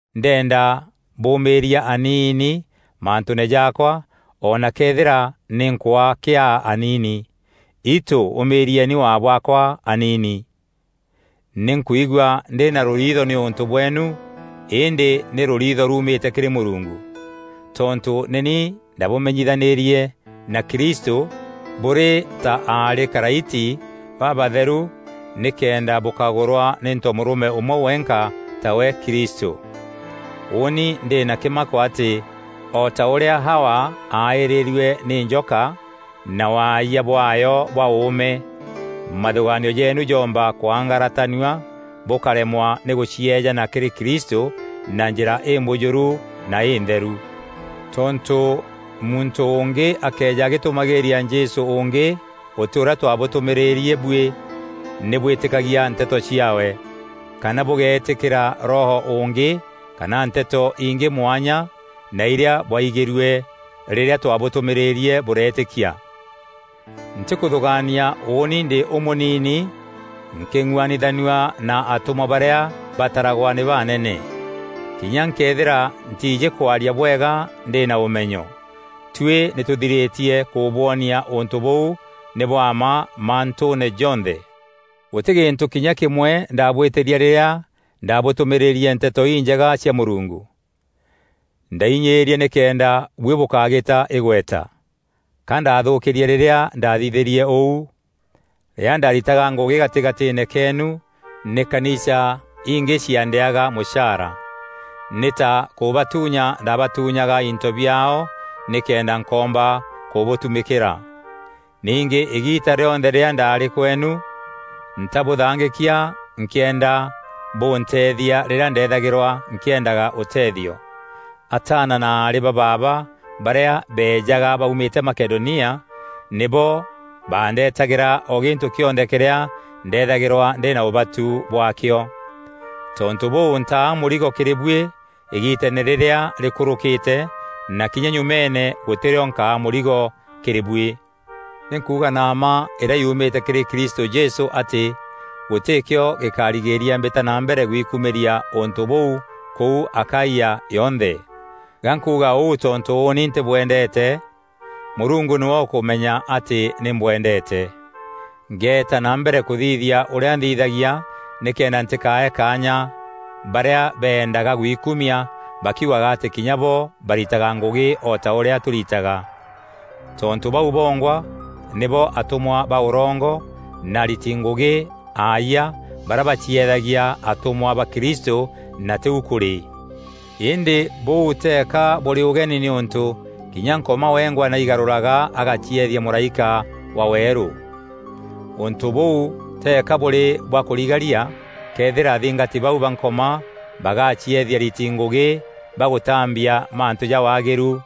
Ndenda bûûmîîria aniini mantûûne jaakwa o na këethîra nî nkwaa kîaa aniini. Itû ûmîîrieni waa bwaakwa aniini! Nî nkwigua ndî na rûriitho nîûntû bweenu, îndî nî rûriitho rumîte kîrî Mûrungu. Tontû nî ni ndabûmenyithanîrie na Kristû bûrî ta aarî karaiti babatheru nîkenda bûkagûrwa nî ntomûrûme ûmwe wenka tawe Kristû. Ûûni ndî na kîmako atî o ta ûrîa Hawa aaîrîrue nî njoka na waayia bwaayo bwa ûûme, mathûgaanio jeenu joomba kwangaratanua bûkaremwa nî gûcieejana kîrî Kristû na njîra îmbûjûru na întheru. Tontû muntû ûngî akëeja agîtûmagîîria Jesû ûngî ûtî ûrîa twabûtûmîîrîrie buî nî bwîtîkagia nteto ciaawe; kana bûgeetîkîra Roho ûngî kana Nteto ingî mwanya na irîa bwaigîrue rîrîa twabûtûmîîrîrie bûreetîkia. Ntîkûthûgaania ûûni ndî ûmûnini nkîng'uanithanua na atûmwa barîa bataragwa nî baanene. Kinya nkëethîra ntiijî kwaria bwega ndî na ûmenyo. Tuî nî tûthirîtie kûbwonia ûntû bûu nî bwa mma mantûûne jonthe. Gûtî gîntû kinya kîmwe ndabwîtîrie rîrîa ndabûtûmîîrîrie Nteto Injega cia Mûrungu. Ndainyiîrie nîkenda buî bûkagîta îgweta. Ka ndathûûkîrie rîrîa ndathithîrie ûu? Rîrîa ndaritaga ngûgî gatîgatîîne keenu, nî kanisa ingî ciandîaga mûchaara. Nî ta kûbatuunya ndabatuunyaga into biaao nîkenda nkoomba kûbûtumîkîra. Ningî îgiita rîonthe rîrîa ndaarî kweenu, ntabûthangîkia nkîenda bûnteethia rîrîa ndethagîrwa nkîendaga ûteethio. Ataana na aarî ba baaba barîa beejaga baumîte Makedonia nîbo baandetagîra o gîntû kîonthe kîrîa ndeethagîrwa ndî na ûbatu bwaakio. Tontû bûu ntaa mûrigo kîrî buî îgiiteene rîrîa rîkûrûkîte na kinya nyumeene gûtî rîo nkaa mûrigo kîrî buî. Nî nkuuga na mma îrîa yuumîte kîrî Kristû Jesû atî gûtîkîo gîkarigîîria mbîta na mbere gwikumîria ûntû bûu kûu Akaia yonthe. Ga nkuuga ûu tontû ûûni ntîbwendeete? Mûrungu nîwe ûkûmenya atî nî mbwendeete. Ngeeta na mbere kûthithia ûrîa nthithagia nîkenda ntîkae kaanya barîa bendaga gwikumia bakiugaga atî kinya bo baritaga ngûgî o ta îrîa tûritaga. Tontû bau bongwa nîbo atûmwa ba ûrongo na ariti ngûgî aayia barîa bacieethagia atûmwa ba Kristû na tîu kûrî. Îndî bûu teeka bûrî ûgeni nîûntû kinya Nkoma wengwa nî aigarûraga agacieethia mûraîka wa weerû. Ûntû bûu teeka bûrî bwa kûrigaria këethîra athingati bau ba Nkoma bagacieethia ariti ngûgî ba gûtambia mantû ja waagîru.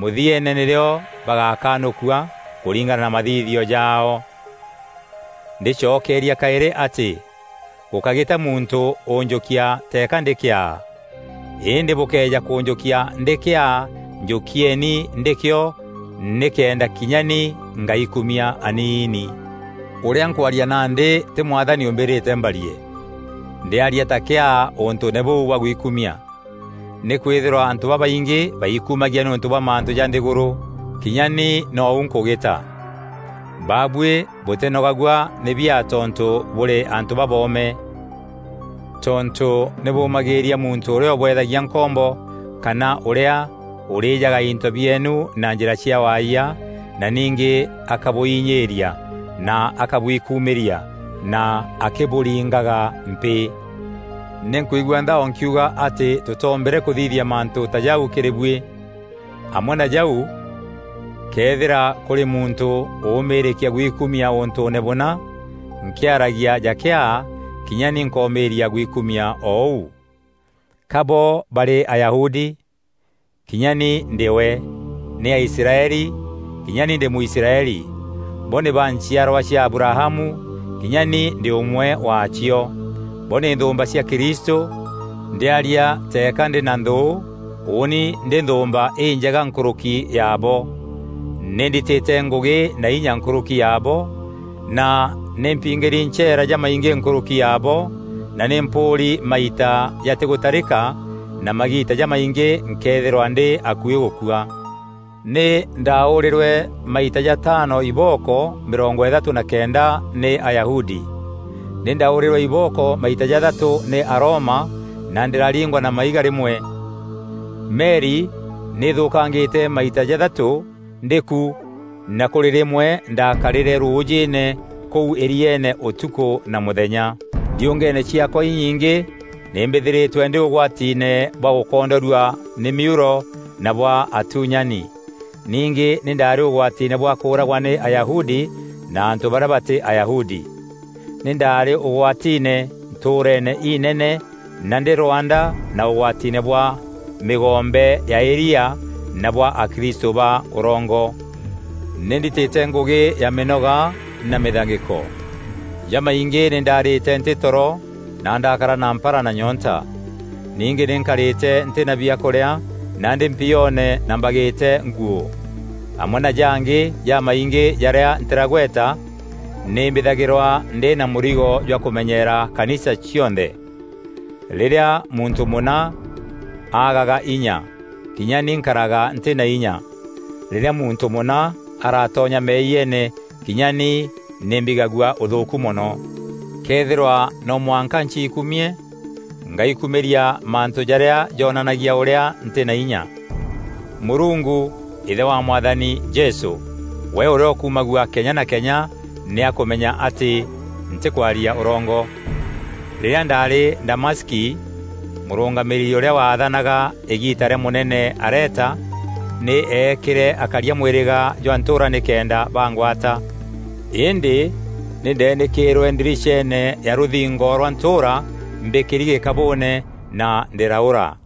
Mûthieene nîrîo bagakanûkua kûringana na mathithio jaao. Ndîcokeeria kaîrî atî gûkágîta muntû ûnjûkia teeka ndî kîaa. Îndî bûkëeja kûnjûkia ndî kîaa njûkieni ndîkîo nîkenda kinya ni ngaikumia aniini. Ûrîa nkwaria nandî tî Mwathani ûmbîrîte mbarie. Ndîaria ta kîaa ûntûûne bûu bwa gwikumia. Nîkwîthîrwa antû babaingî baikumagia nîûntû bwa mantû ja nthîgûrû, kinya ni nou nkûgîta. Babuî bûtînogagua nî biaa tontû bûrî antû baboome! Tontû nî bûmagîîria muntû ûrîa ûbweethagia nkombo kana ûrîa ûrîjaga into bieenu na njîra cia waayia na ningî akabûinyîîria na akabwikumîria na akîbûûringaga mpîî. Nî nkwigua nthao nkiuga atî tûtombîre kûthithia mantû ta jau kîrî buî. Amwe na jau këethîra kûrî muntû ûûmîîrîkia gwikumia ûntûûne bûna, nkîaragia ja kîaa, kinya ni nkomîîria gwikumia o ûu. Ka bo barî Ayahudi? Kinya ni ndî we. Nî Aisraeli? Kinya ni ndî Mûisraeli. Bo nî ba nchiarwa cia Abrahamu? Kinya ni ndî ûmwe waacio. Bo nî nthûûmba cia Kristû? Ndîaria teeka ndî na nthû ûûni ndî nthûûmba înjega nkûrûki yabo. Nî nditîte ngûgî na inya nkûrûki yabo, na nî mpiingîri ncheera jamaingî nkûrûki yabo, na nî mpûûri maita jatîgûtarîka na magiita ja maingî nkeethîrwa ndî akuî gûkua. Nî ndaûrîrwe maita jataano ibooko mîrongo îthatû na kenda nî Ayahudi. Nî ndaûrîrwe ibooko maita jathatû nî Aroma, na ndîraringwa na maiga rîmwe. Meri nî ithûûkangîte maita jathatû ndî ku na kûrî rîmwe ndakarîre rûûjîîne kûu îrieene ûtukû na mûthenya. Ndiûngeene ciaakwa inyingî nî mbîthîrîtwe ndî ûgwatiine bwa gûkondorua nî mîuro na bwa atuunyani. Ningî nî ndaarî ûgwatiine bwa kûûragwa nî Ayahudi na antû barîa batî Ayahudi. Nî ndaarî ûgwatiine ntûûreene inene na ndî rwanda na ûgwatiine bwa mîgombe ya îria na bwa akristû ba ûrongo. Nî nditîte ngûgî ya mînoga na mîthangîko. Jamaingî nî ndaarîte ntî toro na ndaakara na mpara na nyoonta. Ningî nî nkarîte ntî na biakûrîa na ndî mpioone na mbagîte nguû. Amwe na jangî jamaingî jaarîa ntîragweta, nî mbîthagîrwa ndî na mûrigo jwa kûmenyeera kanisa cionthe. Rîrîa muntû mûna agaga inya, kinya ni nkaraga ntî na inya; rîrîa muntû mûna aratonya meeyiene kinya ni nî mbigagua ûthûûku mono. Këethîrwa noo mwanka nciikumie, ngaikumîria mantû jarîa joonanagia ûrîa ntî na inya. Mûrungu, Îthe wa Mwathani Jesû, we ûrîa ûkumagua kenya na kenya nî akûmenya atî ntîkwaria ûrongo. Rîrîa ndaarî Damaski, mûrûngamîîri ûrîa waathanaga îgiita rîa mûnene Areta, nî eekîre akaria mwîrîga jwa ntûûra nîkenda bangwata, îndî nî ndeenîkîîrwe ndiriceene ya rûthingo rwa ntûûra mbîkîri gîkabûûne na ndîraûra.